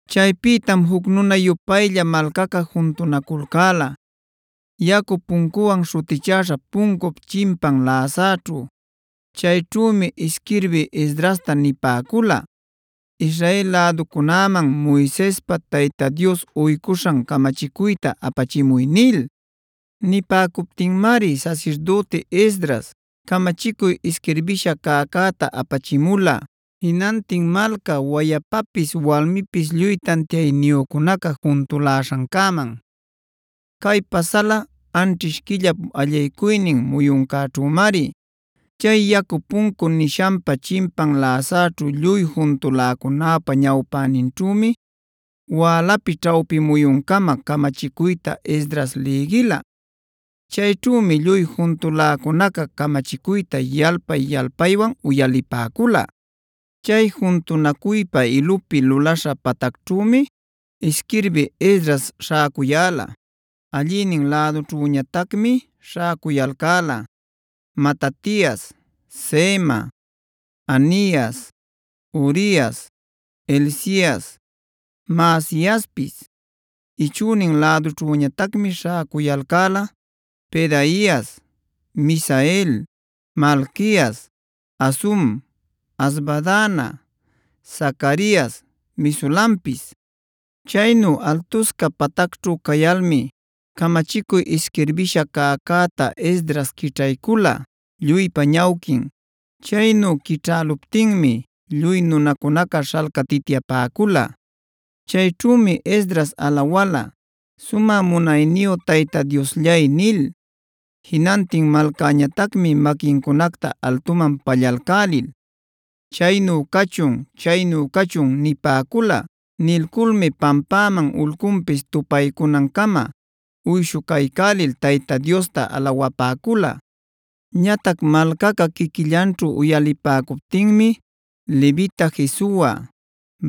Chaypïtam juc nuna-yupaylla malcaca juntunaculcäla Yacu Puncuwan śhutichäśha puncup chimpan läsaćhu. Chayćhümi isquirbï Esdrasta nipäcula: “Israel läducunäman Moisespa Tayta Dios uycuśhan camachicuyta apachimuy” nil. Nipäcuptinmari sasirdüti Esdras camachicuy isquirbïsha cäcäta apachimula jinantin malca wayapapis walmipis lluy tantiayniyücunaca juntuläśhancäman. Cay pasala anćhish quillap allaycuynin muyuncäćhümari. Chay Yacu Puncu nishanpa chimpan läsaćhu lluy juntuläcunäpa ñawpäninćhümi wälapi ćhawpi muyuncama camachicuyta Esdras lïgila. Chayćhümi lluy juntuläcunaca camachicuyta yalpay-yalpaywan uyalipäcula. Chay juntunacuypä ilupi luläśha patacćhümi isquirbï Esdras śhäcuyäla. Allïnin lädućhüñatacmi śhacuyalcäla: Matatias, Sema, Anias, Urias, Hilcias, Maasiaspis. Ichünin lädućhüñatacmi śhäcuyalcäla: Pedaias, Misael, Malquias, Hasum, Hasbadana, Zacarias, Mesulampis. Chaynu altusca patacćhu cayalmi camachicuy isquirbïsha cäcäta Esdras quićhaycula lluypa ñawquin. Chaynu quićhäluptinmi lluy nunacunaca śhalcatityapäcula. Chayćhümi Esdras alawala: “Sumä munayniyu Tayta Diosllay” nil. Jinantin malcäñatacmi maquincunacta altuman pallalcälil: “Chaynu cachun, chaynu cachun” nipäcula. Nilculmi pampäman ulcunpis tupaycunancama uyshucaycälil Tayta Diosta alawapäcula. Ñatac malcaca quiquillanćhu uyalipäcuptinmi levita Jesua,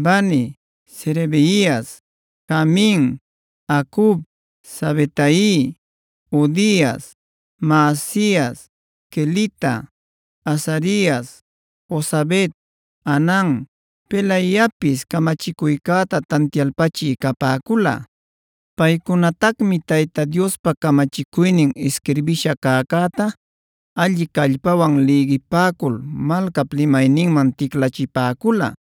Bani, Serebias, Jamin, Acub, Sabetai, Hodias, Maasias, Kelita, Azarias, Jozabed, Hanan, Pelaiapis camachicuycäta tantialpachï capäcula. Paycunatacmi Tayta Diospa camachicuynin isquirbïsha cäcäta alli callpawan lïgipäcul malcap limayninman ticlachipäcula,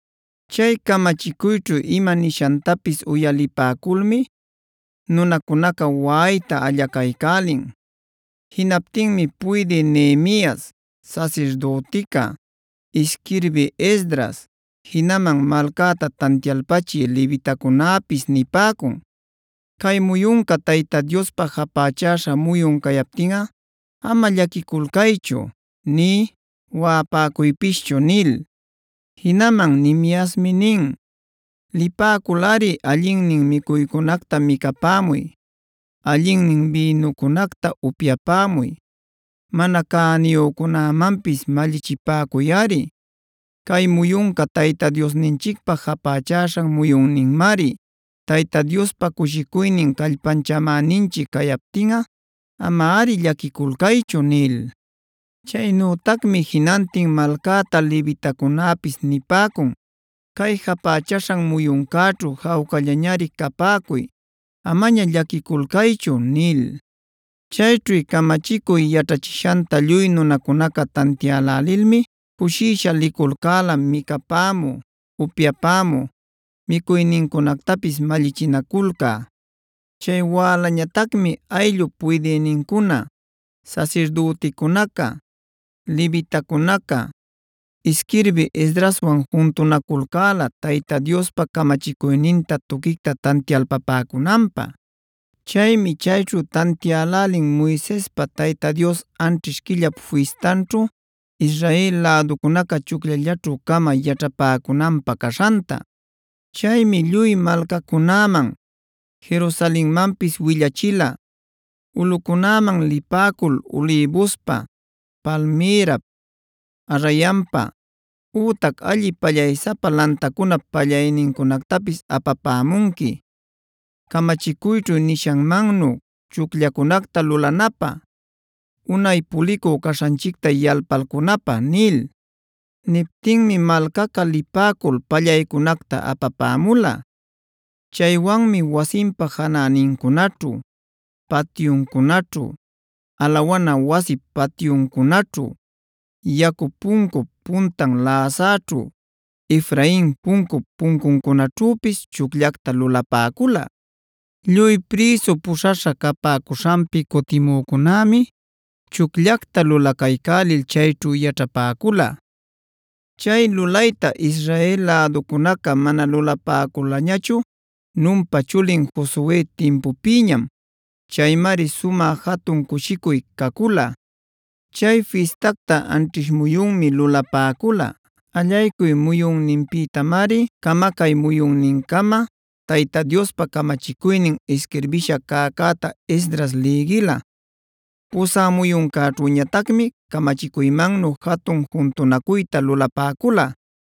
Chay camachicuyćhu ima nishantapis uyalipäculmi nunacunaca waꞌayta allacaycälin. Jinaptinmi puydï Nehemias, sasirdütica, isquirbï Esdras, jinaman malcäta tantialpachï levitacunäpis nipäcun: “Cay muyunca Tayta Diospa japächäśha muyun cayaptinꞌa ama llaquiculcaychu nï waꞌapäcuypischu” nil. Jinaman Nehemiasmi nin: “Lipäculꞌari allinnin micuycunacta micapämuy, allinnin bïnucunacta upyapämuy. Mana cäniyücunämanpis mallichipäcuyꞌari. Cay muyunca Tayta Diosninchicpä japächaśhan muyunninmari. Tayta Diospa cushicuynin callpanchamäninchic cayaptinꞌa amari llaquiculcaychu” nil. Chaynütacmi jinantin malcäta levitacunäpis nipäcun: “Cay japächaśhan muyuncäćhu jawcallañari capäcuy; amaña llaquiculcaychu” nil. Chayćhu camachicuy yaćhachishanta lluy nunacunaca tantiälälilmi cushisha liculcäla micapämü, upyapämü, micuynincunactapis mallichinaculcä. Chay wälañatacmi ayllup puydïnincuna, sasasirdüticunaca, levitacunaca, isquirbï Esdraswan juntunaculcäla Tayta Diospa camachicuyninta tuquicta tantialpapäcunanpä. Chaymi chayćhu talïlälin Moisespa Tayta Dios anćhish quillap fistanćhu Israel läducunaca chucllallaćhu-camab yaćhapäcunanpä caśhanta.c Chaymi lluy malcacunäman, Jerusalenmanpis willachila: “Ulꞌucunäman lipäcul ulïbuspa, palmïrap, arrayanpa, ütac alli pallaysapa lantacunap pallaynincunactapis apapämunqui, camachicuyćhu nishanmannu chucllacunacta lulanapä, unay pulicü caśhanchicta yalpalcunapä” nil. Niptinmi malcaca lipäcul pallaycunacta apapämula. Chaywanmi wasinpa janänincunaćhu, patyuncunaćhu, alawana wasip patyuncunaćhu, Yacu Puncup puntan läsaćhu, Efrain Puncup puncuncunaćhüpis chucllacta lulapäcula. Lluy prïsu puśhaśha capäcuśhanpi cutimücunämi chucllacta lulacaycälil chayćhu yaćhapäcula. Chay lulayta Israel läducunaca mana lulapäculañachu Nunpa chulin Josue timpupïñam. Chaymari sumä jatun cushicuy cacula. Chay fistacta anćhish muyunmi lulapäcula. Allaycuy muyunninpïtamari camacay muyunnincama Tayta Diospa camachicuynin isquirbïsha cäcäta Esdras lïgila. Pusä muyuncäćhüñatacmi camachicuymannu jatun juntunacuyta lulapäcula.